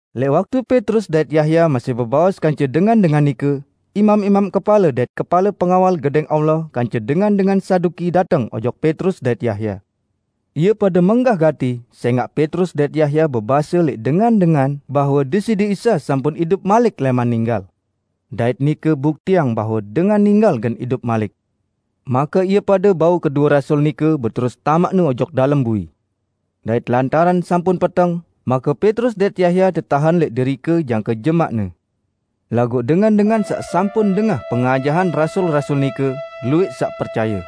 Lẽq waktu Petrus dait Yahya masih bebaos kance dengan-dengan nike, imam-imam kepale dait kepale pengawal Gedẽng Allah kance dengan-dengan Saduki dateng ojok Petrus dait Yahya. Ie pade menggah gati sẽngaq Petrus dait Yahya bebase lẽq dengan-dengan bahwe Deside Isa sampun idup malik lẽman ninggal. Dait nike buktiang bahwe dengan ninggal gen idup malik. Make ie pade bau kedue rasul nike beterus tamaqne ojok dalem bui. Dait lantaran sampun peteng, make Petrus dait Yahya tetahen lẽq derike jangke jemaqne. Laguq dengan-dengan saq sampun dengah pengajahan rasul-rasul nike, luwẽq saq percaye.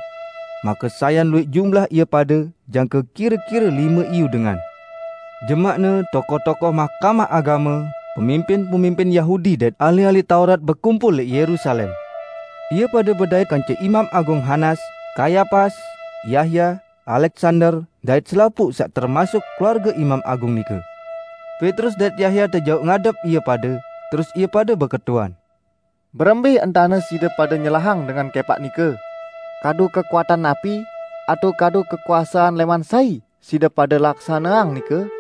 Make sayan luwẽq jumlah ie pade, jangke kire-kire lime iyu dengan. Jemaqne tokoh-tokoh Mahkamah Agame, pemimpin-pemimpin Yahudi dait ahli-ahli Taurat bekumpul lẽq Yerusalem. Ie pade bedait kance Imam Agung Hanas, Kayapas, Yahya, Aleksander, dait selapuq saq termasuk keluarge Imam Agung nike. Petrus dait Yahya tejauq ngadep ie pade, terus ie pade beketuan, "Berembẽ entane side pade nyelahang dengan kẽpaq nike? Kadu kekuatan napi atao kadu kekuasean lẽman sai side pade laksaneang nike?"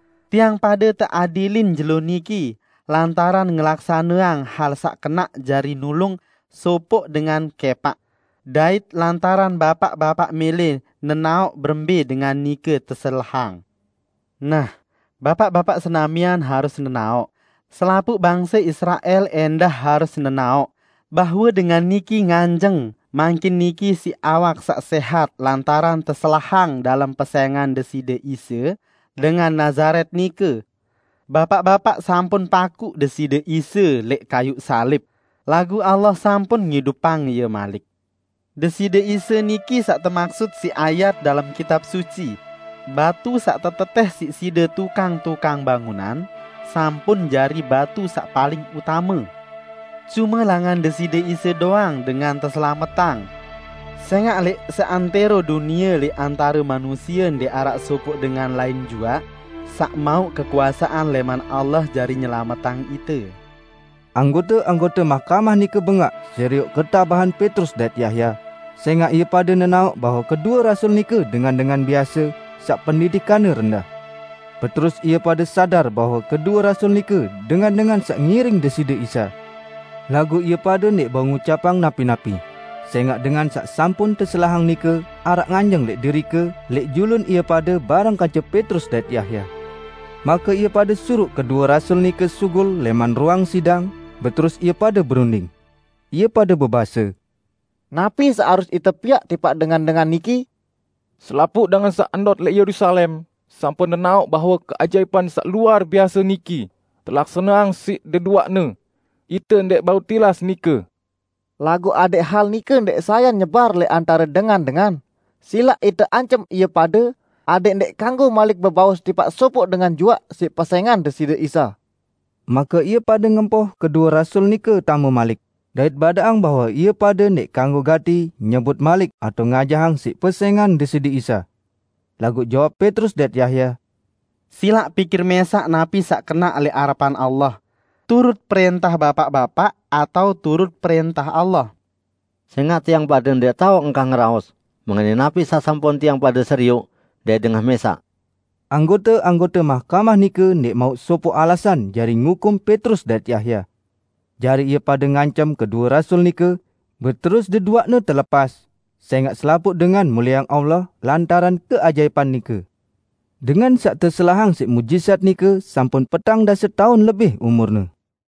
Tiang pade teadilin jelo niki lantaran ngelaksaneang hal saq kenaq jari nulung sopoq dengan kẽpaq, dait lantaran Bapaq-bapaq mẽlẽ nenaoq berembẽ dengan nike teselahang. Nah, Bapaq-bapaq senamian harus nenaoq, selapuq bangse Israel ẽndah harus nenaoq bahwe dengan niki nganjeng mangkin niki siq awak saq sẽhat lantaran teselahang dalem pesẽngan Deside Isa, dengan Nazaret nike. Bapaq-bapaq sampun pakuq Deside Isa lẽq kayuq salib, laguq Allah sampun ngidupang Ie malik. Deside Isa niki saq temaksut siq ayat dalem Kitab Suci, 'Batu saq tetetẽh siq side tukang-tukang bangunan, sampun jari batu saq paling utame.' Cume langan Deside Isa doang dengan teselametang. Sẽngaq lẽq seantẽro dunie lẽq antare manusie ndẽq araq sopoq dengan lain juaq saq mauq kekuasean lẽman Allah jari nyelametang ite." Anggote-anggote Mahkamah nike bengaq serioq ketabahan Petrus dait Yahya, sẽngaq ie pade nenaoq bahwe kedue rasul nike dengan-dengan biase saq pendidikanne rendah. Beterus ie pade sadar bahwe kedue rasul nike dengan-dengan saq ngiring Deside Isa. Laguq ie pade ndẽq bau ngucapang napi-napi, sẽngaq dengan saq sampun teselahang nike araq nganjeng lẽq derike lẽq julun ie pade bareng kance Petrus dait Yahya. Make ie pade suruq kedue rasul nike sugul lẽman ruang sidang, beterus ie pade berunding. Ie pade bebase, "Napi saq harus ite piaq tipaq dengan-dengan niki? Selapuq dengan saq ndot lẽq Yerusalem sampun nenaoq bahwe keajaipan saq luar biase niki, telaksaneang siq deduaqne. Ite ndẽq bau tilas nike. Laguq adẽq hal nike ndaq sayan nyebar lẽq antare dengan-dengan, silaq ite ancem ie pade adẽq ndẽq kanggo malik bebaos tipaq sopoq dengan juaq siq pesẽngan Deside Isa." Make ie pade ngempoh kedue rasul nike tame malik, dait badaqang bahwe ie pade ndẽq kanggo gati nyebut malik atao ngajahang siq pesẽngan Deside Isa. Laguq jawab Petrus dait Yahya, "Silaq pikir mẽsaq napi saq kenaq lẽq arepan Allah: turut prẽntah Bapaq-bapaq atao turut prẽntah Allah. Sẽngaq tiang pade ndẽq tao engkah ngeraos mengenai napi saq sampun tiang pade serioq dait dengah mẽsaq." Anggote-anggote Mahkamah nike ndẽq mauq sopoq alasan jari ngukum Petrus dait Yahya. Jari ie pade ngancem kedue rasul nike, beterus deduaqne telepas, sẽngaq selapuq dengan mulieang Allah lantaran keajaipan nike. Dengan saq teselahang siq muqjizat nike sampun petang dase taun lebih umurne.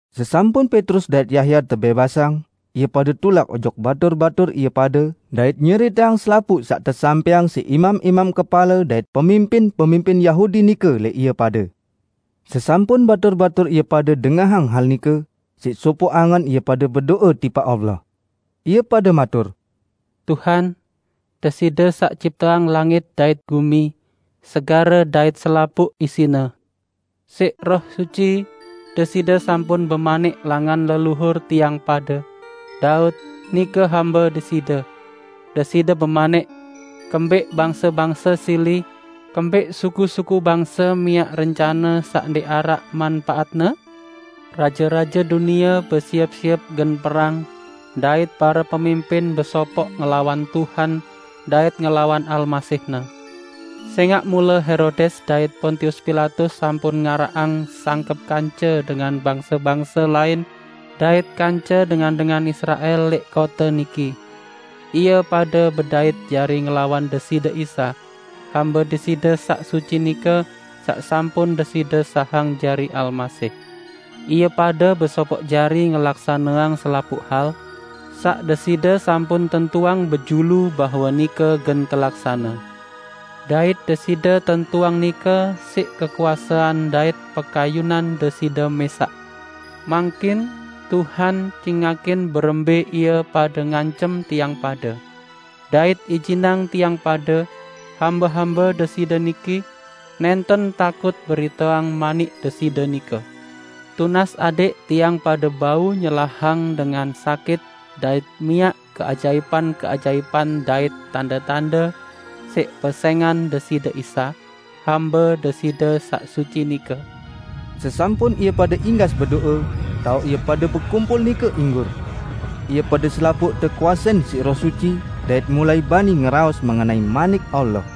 Sesampun Petrus dait Yahya tebẽbasang, ie pade tulak ojok batur-batur ie pade dait nyeriteang selapuq saq tesampẽang siq imam-imam kepale dait pemimpin-pemimpin Yahudi nike lẽq ie pade. Sesampun batur-batur ie pade dengahang hal nike, siq sopog angen ie pade bedo'e tipaq Allah. Ie pade matur, "Tuhan, Deside saq cipteang langit dait gumi, segare dait selapuq isine. Siq Roh Suci, Deside sampun bemanik langan leluhur tiang pade, Daud, nike hambe Deside; Deside bemanik, 'Kembẽq bangse-bangse sili; kembẽq suku-suku bangse miaq rencane saq ndẽq araq manpaatne? Raje-raje dunie besiep-siep gen perang, dait pare pemimpin besopoq ngelawan Tuhan dait ngelawan Almasih-Ne.' Sẽngaq mule Herodes dait Pontius Pilatus sampun ngaraqang sangkep kance dengan bangse-bangse lain dait kance dengan-dengan Israel lẽq kote niki. Ie pade bedait jari ngelawan Deside Isa, Hambe Deside saq suci nike, saq sampun Deside sahang jari Almasih. Ie pade besopoq jari ngelaksaneang selapuq hal, saq Deside sampun tentuang bejulu bahwe nike gen telaksane. Dait Deside tentuang nike siq kekuasean dait pekayunan Deside mẽsaq. Mangkin, Tuhan, cingakin berembẽ ie pade ngancem tiang pade. Dait ijinang tiang pade, hambe-hambe Deside niki, nẽnten takut beriteang Manik Deside nike. Tunas adẽq tiang pade bau nyelahang dengan sakit dait miaq keajaipan-keajaipan dait tande-tande siq pesẽngan Deside Isa, Hambe Deside saq suci nike." Sesampun ie pade inggas bedo'e, taoq ie pade bekumpul nike inggur. Ie pade selapuq tekuasein siq Roh Suci, dait mulai bani ngeraos mengenai Manik Allah.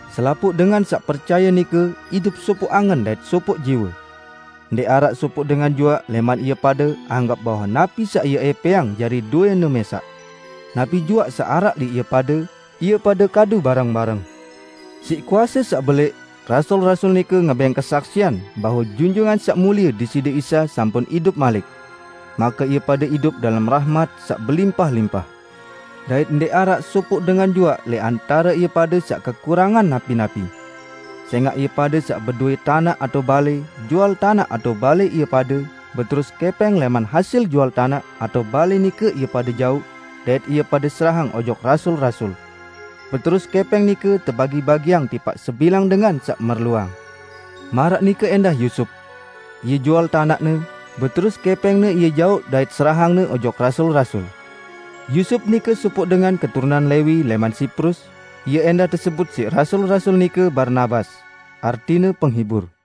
Selapuq dengan saq percaye nike idup sopoq angen dait sopoq jiwe. Ndẽq araq sopoq dengan juaq lẽman ie pade anggep bahwe napi saq ie ẽpẽang jari dowẽne mẽsaq. Napi juaq saq araq lẽq ie pade, ie pade kadu bareng-bareng. Siq kuase saq belẽq, rasul-rasul nike ngebẽng kesaksian bahwe Junjungan Saq Mulie Deside Isa sampun idup malik. Make ie pade idup dalem rahmat saq belimpah-limpah. Dait ndẽq araq sopoq dengan juaq lẽq antare ie pade saq kekurangan napi-napi. Sẽngaq ie pade saq bedowẽ tanaq atao balẽ, jual tanaq atao balẽ ie pade; beterus kẽpẽng lẽman hasil jual tanaq atao balẽ nike ie pade jauq dait ie pade serahang ojok rasul-rasul. Beterus kẽpẽng nike tebagi-bagiang tipaq sebilang dengan saq merluang. Maraq nike ẽndah Yusup. Ie jual tanaqne, beterus kẽpẽngne ie jauq dait serahangne ojok rasul-rasul. Yusup nike sopoq dengan keturunan Lewi lẽman Siprus; ie ẽndah tesebut siq rasul-rasul nike Barnabas (artine Penghibur).